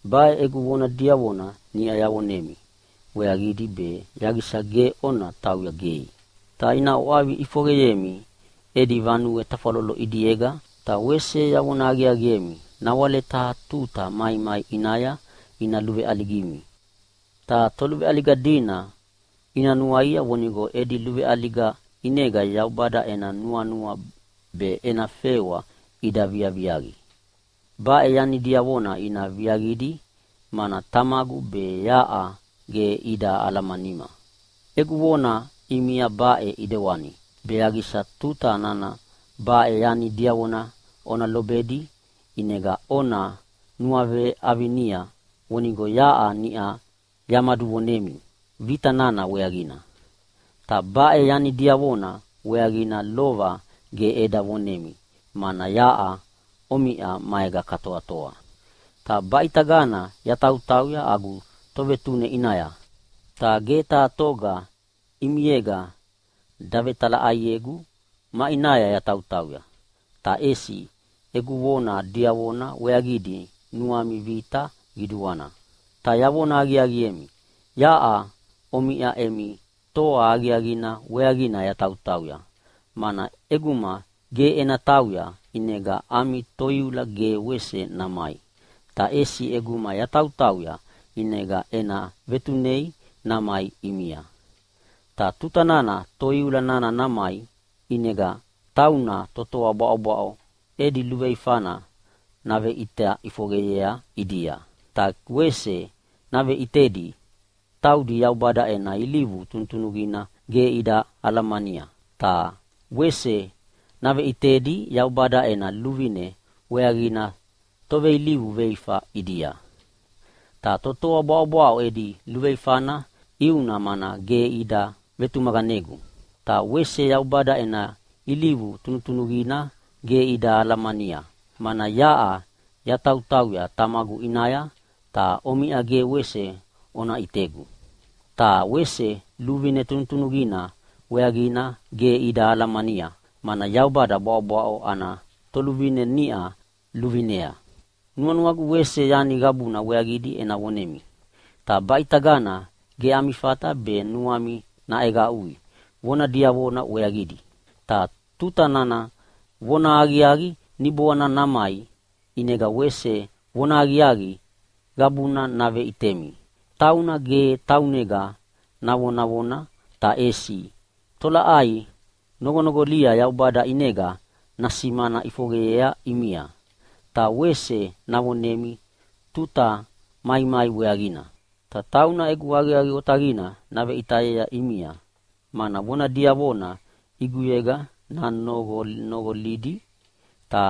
“Baʼe egu vona diavona niʼa yavonemi weaqidi be yaqisa ge ona tauya gei. Ta ina ʼwavi ʼifoqeyemi edi vanue tafwalolo ʼidiega, ta wese yavona aqiaqiemi nawale taha tuta maimai ʼinaya ina luveʼaligimi, ta toluveʼaliga dina ina nuaia vonigo edi luveʼaliga ʼinega Yaubada ena nuanua be ena fewa ida viaviaqi. Baʼe yani diavona ina viaqidi, mana Tamagu be yaʼa ge ida alamanima. Egu vona ʼimia baʼe ʼidewani be yaqisa tuta nana baʼe yani diavona ona lobedi ʼinega ona nuaveʼavinia vonigo yaʼa niʼa yamaduvonemi vita nana weaqina. Ta baʼe yani diavona weaqina lova ge eda vonemi mana yaʼa omiʼa maega katoatoa. “Ta baʼitagana yatautauya agu Tovetune ʼinaya, ta ge taha toga ʼimiega davetalaʼaiegu maʼinaya yatautauya. Ta ʼesi egu vona diavona weaqidi nuami vita qiduana. Ta yavona aqiaqiemi, yaʼa omiʼa emi toa aqiaqina weaqina yatautauya. Mana ʼeguma ge ena tauya, ʼinega ami Toiula ge wese namai, ta ʼesi ʼeguma yatautauya ʼinega ena vetunei namai ʼimia. Ta tutana Toiula nana namai ʼinega tauna totoa bwaʼobwaʼo edi luveifana naveʼita ʼifoqeyea ʼidia, ta wese naveʼitedi taudi Yaubada ena ilivu tunutunuqina ge ida alamania, ta wese naveʼitedi Yaubada ena luvine weaqina toveilivu veifa ʼidia. Ta totoa bwaʼobwaʼo edi luveifana ʼiuna mana ge ida vetumaqanegu. Ta wese Yaubada ena ilivu tunutunuqina ge ida alamania, mana yaʼa yatautauya Tamagu ʼinaya, ta omiʼa ge wese ona ʼitegu. Ta wese luvine tunutunuqina weaqina ge ida alamania, mana Yaubada bwaʼobwaʼo ana toluvine niʼa luvinea. “Nuanuagu wese yani qabuna weaqidi ena vonemi, ta baʼitagana ge ami fata be nuami naʼeqaʼui vona diavona weaqidi. Ta tuta nana vonahaqiaqi Niboanina namai, ʼinega wese vonahaqiaqi qabuna naveʼitemi. Tauna ge taunega navonavona, ta ʼesi tolaʼai noqonoqolia Yaubada ʼinega nasimana ʼifoqeyea ʼimia, ta wese navonemi tuta maimai weaqina. Ta tauna egu aqiaqi otaqina naveʼitayea ʼimia, mana vona diavona ʼiguyega nanoqonoqolidi, ta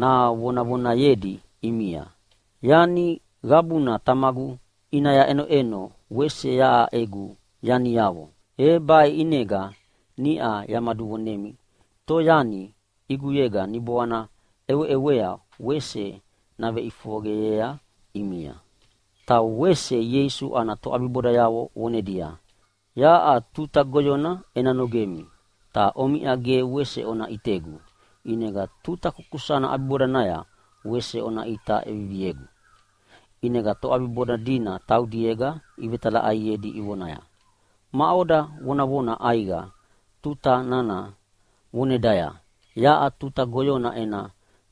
navonavonayedi ʼimia. Yani qabuna Tamagu ʼinaya ʼenoʼeno wese yaʼa egu yaniavo. E baʼe ʼinega niʼa yamaduvonemi toyani ʼiguyega Niboana ʼeweʼewea wese naveʼifoqeyea ʼimia.” Ta wese Ieisu ana toʼabibodayavo vonedia, “Yaʼa tuta goyona ena nogemi, ta omiʼa ge wese ona ʼitegu. ʼInega tuta kukusana ʼabibodanaya wese ona ʼita ʼeviviegu.” ʼInega toʼabiboda dina taudiega ivetalaʼaiedi ivonaya, “Maʼoda vonavona ʼaiqa tuta nana vonedaya, ‘Yaʼa tuta goyona ena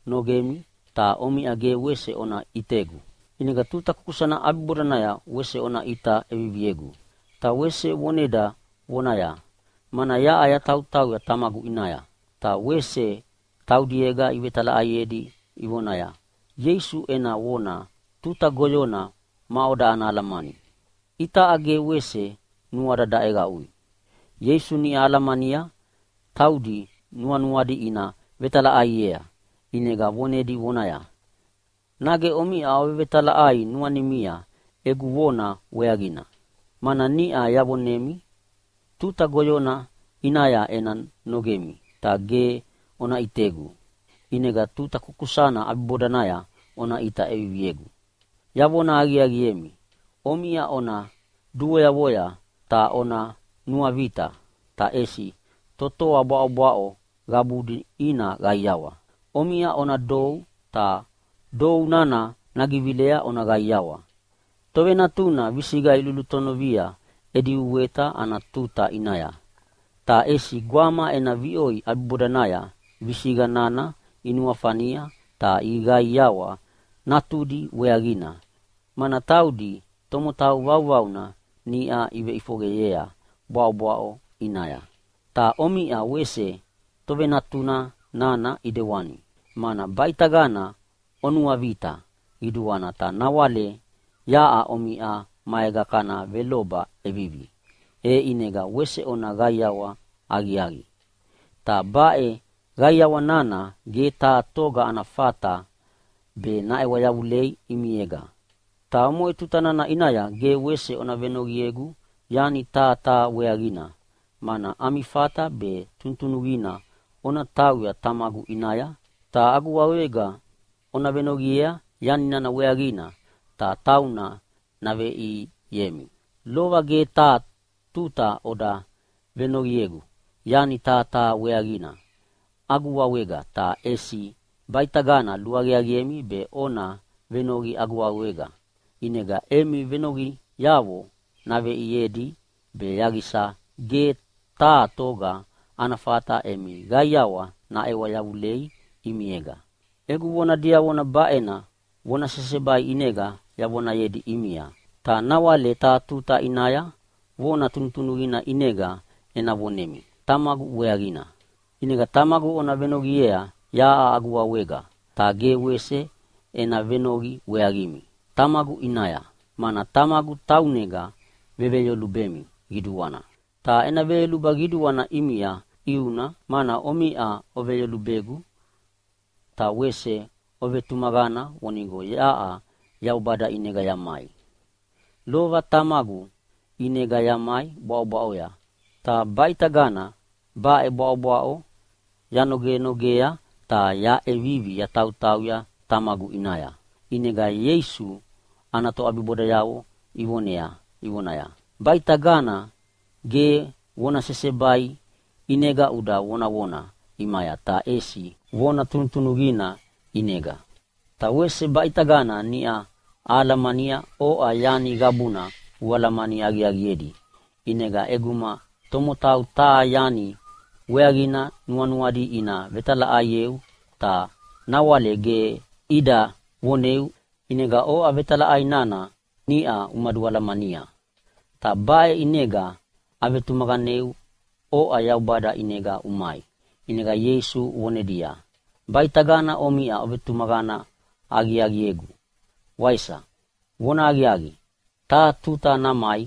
nogemi, ta omiʼa ge wese ona ʼitegu. ʼInega tuta kukusana ʼabibodanaya wese ona ʼita ʼeviviegu.’ Ta wese voneda vonaya, ‘Mana yaʼa yatautauya Tamagu ʼinaya.’” Ta wese taudiega ivetalaʼaiedi ivonaya, “Ieisu ena vona, ‘tuta goyona’, maʼoda ana alamani? Itaʼa ge wese nuada daʼeqaʼui.” Ieisu niʼa alamania taudi nuanuadi ina vetalaʼaiea, ʼinega vonedi vonaya, “Nage omiʼa ovevetalaʼai nuanimia egu vona weaqina? Mana niʼa yavonemi tuta goyona ʼinaya ena nogemi, ta ge ona ʼitegu. ʼInega tuta kukusana ʼabibodanaya ona ʼita ʼeviviegu. Yavona aqiaqiemi, omiʼa ona duvoyavoya ta ona nuavita, ta ʼesi totoa bwaʼobwaʼo qabudi ina qaiawa. Omiʼa ona dou, ta dou nana nagivilea ona qaiawa. “Tovenatuna visiqa ilulutonovia edi uweta ana tuta ʼinaya, ta ʼesi gwama ena viʼoi ʼabibodanaya visiqa nana inuafania ta iqaiqaiawa natudi weaqina, mana taudi tomotau vauvauna niʼa iveʼifoqeyea bwaʼobwaʼo ʼinaya. Ta omiʼa wese tovenatuna nana ʼidewani, mana baʼitagana onuavita qiduana, ta nawale yaʼa omiʼa maega kana veloba ʼevivi, e ʼinega wese ona qaiawa aqiaqi. Ta baʼe qaiawa nana ge taha toga ana fata be naʼewa yavulei ʼimiega. Ta omoʼe tuta nana ʼinaya ge wese ona venoqiegu yani taha taha weaqina, mana ami fata be tunutunuqina ona tauya Tamagu ʼinaya ta agu wawega ona venoqiea yani nana weaqina ta tauna naveʼiemi. Lova ge taha tuta oda venoqiegu yani taha taha weaqina agu wawega, ta ʼesi baʼitagana luaqiaqiemi be ona venoqi agu wawega. ʼInega emi venoqiavo naveʼiedi be yaqisa ge taha toga ana fata emi qaiawa naʼewa yavulei ʼimiega. “Egu vona diavona baʼena vona sesebai ʼinega yavonayedi ʼimia, ta nawale taha tuta ʼinaya vona tunutunuqina ʼinega ena vonemi Tamagu weaqina. ʼInega Tamagu ona venoqiea yaʼa agu wawega, ta ge wese ena venoqi weaqimi Tamagu ʼinaya, mana Tamagu taunega veveyolubemi qiduana. Ta ena veyoluba qiduana ʼimia ʼiuna, mana omiʼa oveyolubegu ta wese ovetumaqana vonigo yaʼa Yaubada ʼinega yamai. Lova Tamagu ʼinega yamai bwaʼobwaʼoya, ta baʼitagana baʼe bwaʼobwaʼo yanogenogea ta yaʼevivi yatautauya Tamagu ʼinaya.” ʼInega Ieisu ana toʼabibodayavo ivonea ivonaya, “Baʼitagana ge vona sesebai ʼinega uda vonavona ʼimaya, ta ʼesi vona tunutunuqina ʼinega. Ta wese baʼitagana niʼa ahalamania oʼa yani qabuna ualamani aqiaqiedi. ʼInega ʼeguma tomotau taha yani weaqina nuanuadi ina vetalaʼaieu, ta nawale ge ida voneu, ʼinega oʼa vetalaʼai nana niʼa umadualamania. Ta baʼe ʼinega avetumaqaneu oʼa Yaubada ʼinega umai.” ʼInega Ieisu vonedia, “Baʼitagana omiʼa ovetumaqana aqiaqiegu, waisa? Vonahaqiaqi, taha tuta namai,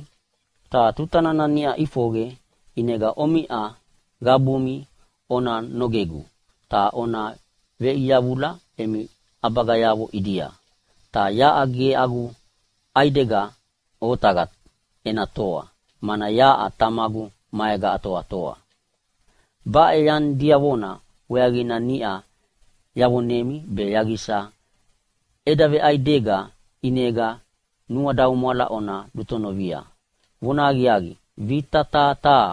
ta tuta nana niʼa ʼifoqe, ʼinega omiʼa qabumi ona nogegu ta ona veʼiyavula emi ʼabagayavo ʼidia. Ta yaʼa ge agu ʼaidega otaqa ena toa, mana yaʼa Tamagu maega atoatoa. Baʼe yani diavona weaqina niʼa yavonemi be yaqisa eda veʼaidega ʼinega nuadaumwala ona lulutonovia. Vonahaqiaqi, vita taha taha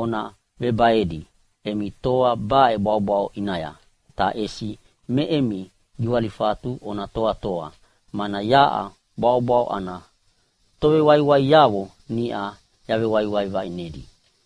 ona vebaedi emi toa baʼe bwaʼobwaʼo ʼinaya. Ta ʼesi me emi giwalifatu ona toatoa, mana yaʼa bwaʼobwaʼo ana tovewaiwaiavo niʼa yavewaiwai vaʼinedi.”